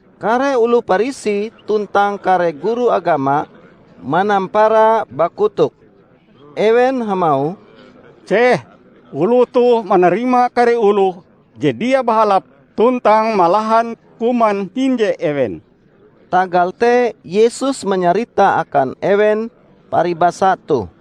Kare oloh Parisi tuntang kare guru agama manampara bakotok. Ewen hamauh, "Ceh, oloh toh manarima kare oloh je dia bahalap tuntang malahan kuman hinje ewen!" Tagal te Yesus manyarita akan ewen paribasa toh.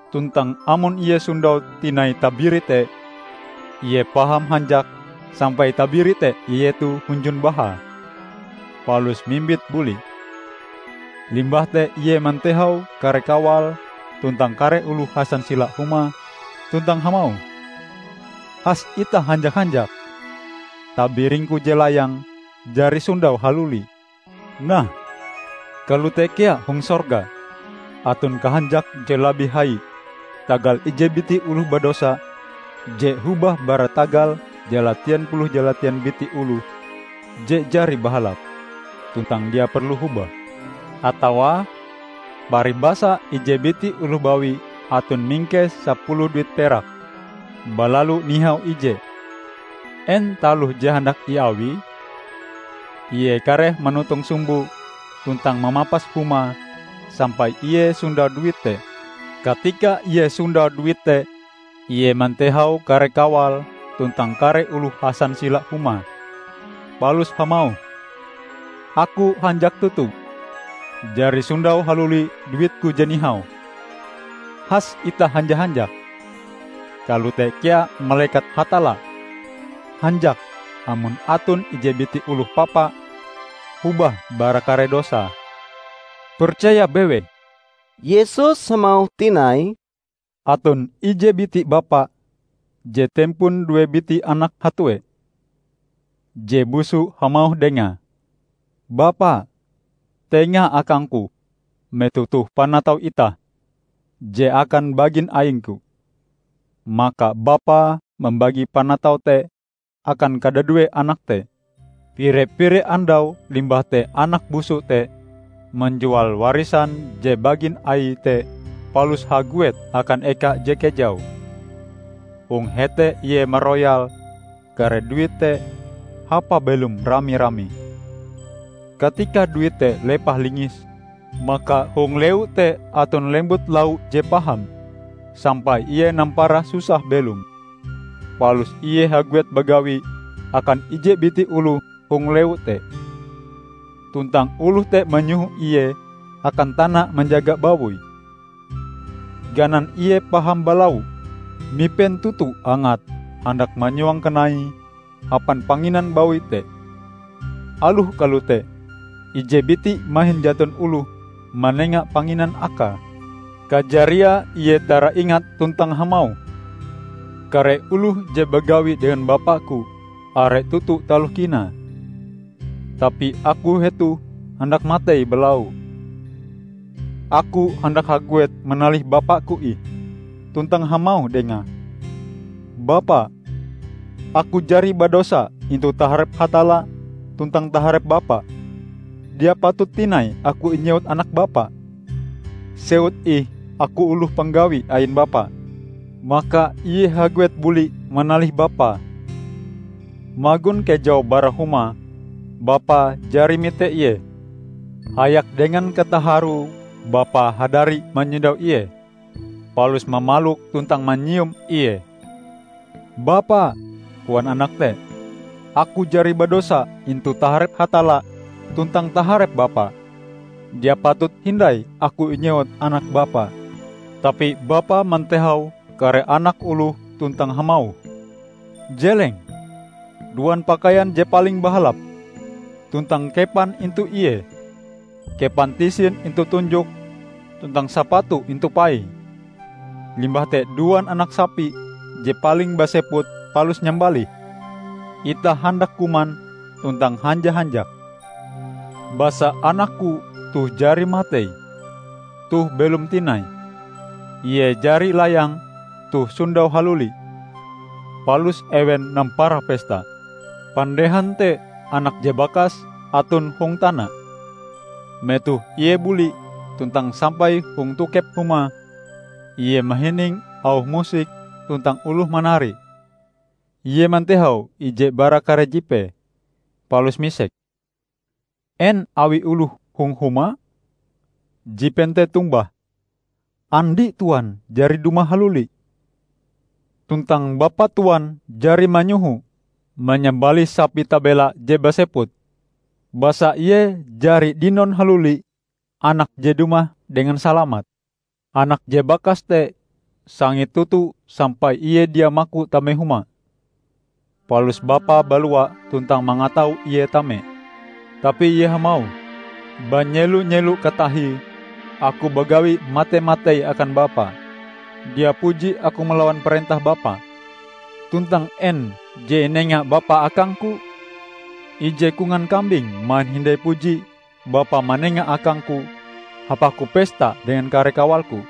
Tuntang amon ie sondau tinai tabiri te, ie paham hanjak sampai tabiri te ietoe hunjun bahae, palus mimbite buli. Limbah te ie mantehau kare kawale tuntang kare oloh hasansila humae, tuntang hamauh, 'Has itah hanja-hanjak. Tabiringku je layang jari sondau haluli!' Nah, kalote kea hong sorga aton kahanjak je labih hai tagal ije biti oloh badosa je hobah bara tagal jalatien puluh jalatien biti oloh je jari bahalap tuntang dia perlu hobah." "Atawa, paribasa ije biti oloh bawi aton mingkes sapuluh duit perak balalu nihau ije -- en taloh je handak iawie? Ie kareh manotong sumboe tuntang mamapas humae sampai ie sondau duit te. Katika ie sondau duit te, ie mantehau kare kawale tuntang kare oloh hasansila humae, palus hamauh, 'Aku hanjak toto jari sondau haluli duitku je nihau. Has itah hanja-hanjak!' Kalote kea malekat Hatalla hanjak amon aton ije biti oloh papa hobah bara kare dosae. Percaya bewei!" Yesus hamauh tinai, "Aton ije biti bapa je tempon due biti anak hatue. Je busu hamauh dengae, 'Bapa, tenga akangku metoh toh panatau itah je akan bagin aingku.' Maka bapae mambagi panataue te akan kadadue anak te. Pire-pire andau limbah te anak busu te manjual warisan je bagin aie te palus haguet akan eka je kejau. Hong hete ie maroyal kare duite hapae belom rami-rami. Katika duite lepah-lingis, maka hong lewu te aton lembut lau je paham, sampai ie nampara susah belom. Palus ie haguet bagawi akan ije biti oloh hong lewu te, tuntang oloh te manyoho ie akan tana manjaga bawoie. Ganan ie paham balau, mipen toto angate handak manyuang kanaie hapan panginan bawoi te. Aloh kalote, ije biti mahin jaton oloh manenga panginan akae. Kajariae ie taraingat tuntang hamauh, 'Kare oloh je bagawi dengan bapaku are toto taloh kinae, tapi aku hetoh handak matei balau! Aku handak haguet manalih bapaku ih, tuntang hamauh dengae: Bapa, aku jari badosa intu taharep Hatalla tuntang taharep Bapa. Dia patut tinai aku inyewut anak bapa. Sewut ih aku oloh panggawi ain bapa.' Maka ie haguet buli manalih bapae. Magon kejau bara huma, bapae jari mite ie. Hayak dengan kataharue bapae hadari manyondau ie, palus mamalok tuntang manyium ie. 'Bapa', koan anak te, 'aku jari badosa intu taharep Hatalla tuntang taharep bapa. Dia patut hindai aku inyewut anak bapa.' Tapi bapae mantehau kare anak oloh tuntang hamauh, 'Jeleng! duan pakaian je paling bahalap, tuntang kepan intu ie. Kepan tisin intu tunjoke, tuntang sapatu intu paie. Limbah te duan anak sapi je paling baseput palus nyambalih! Itah handak kuman tuntang hanja-hanjak. Basa anakku toh jari matei, toh belom tinai; ie jari layang, toh sondau haluli.' Palus ewen nampara pesta. Pandehan te anak je bakas aton hong tana. Metoh ie buli tuntang sampai hong tokep huma, ie mahining auh musik tuntang oloh manari. Ie mantehau ije bara kare jipee, palus misek, 'En awi oloh hong huma?' Jipen te tombah, 'Andi Tuan jari dumah haluli! Tuntang bapa Tuan jari manyoho manyambalih sapi tabela je baseput, basa ie jari dinon haluli anake je dumah dengan salamat!' Anak je bakas te sangit toto sampai ie dia maku tame huma. Palus bapae balua tuntang mangatau ie tame. Tapi ie hamauh, 'Banyelo-nyelo katahie aku bagawi mate-matei akan bapa. Dia puji aku malawan parentah bapa. Tuntang en je inenga bapa akangku? Ije kongan kambing mahin hindai puji bapa manenga akangku hapaku pesta dengan kare kawalku!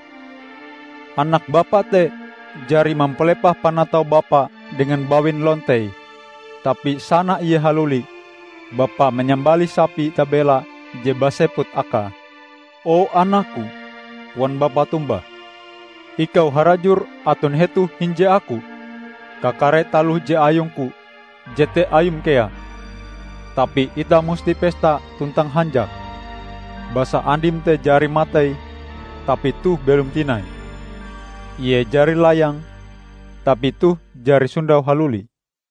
Anak bapa te jari mampalepah panatau bapa dengan bawin lontei, tapi sana ie haluli, bapa manyambalih sapi tabela je baseput akae!' 'O anakku,' koan bapae tombah, 'ikau harajur aton hetoh hinje aku. Kakare taloh je ayungku jete ayum kea. Tapi itah musti pesta tuntang hanjak, basa andim te jari matei, tapi toh belom tinai; ie jari layang, tapi toh jari sondau haluli.' "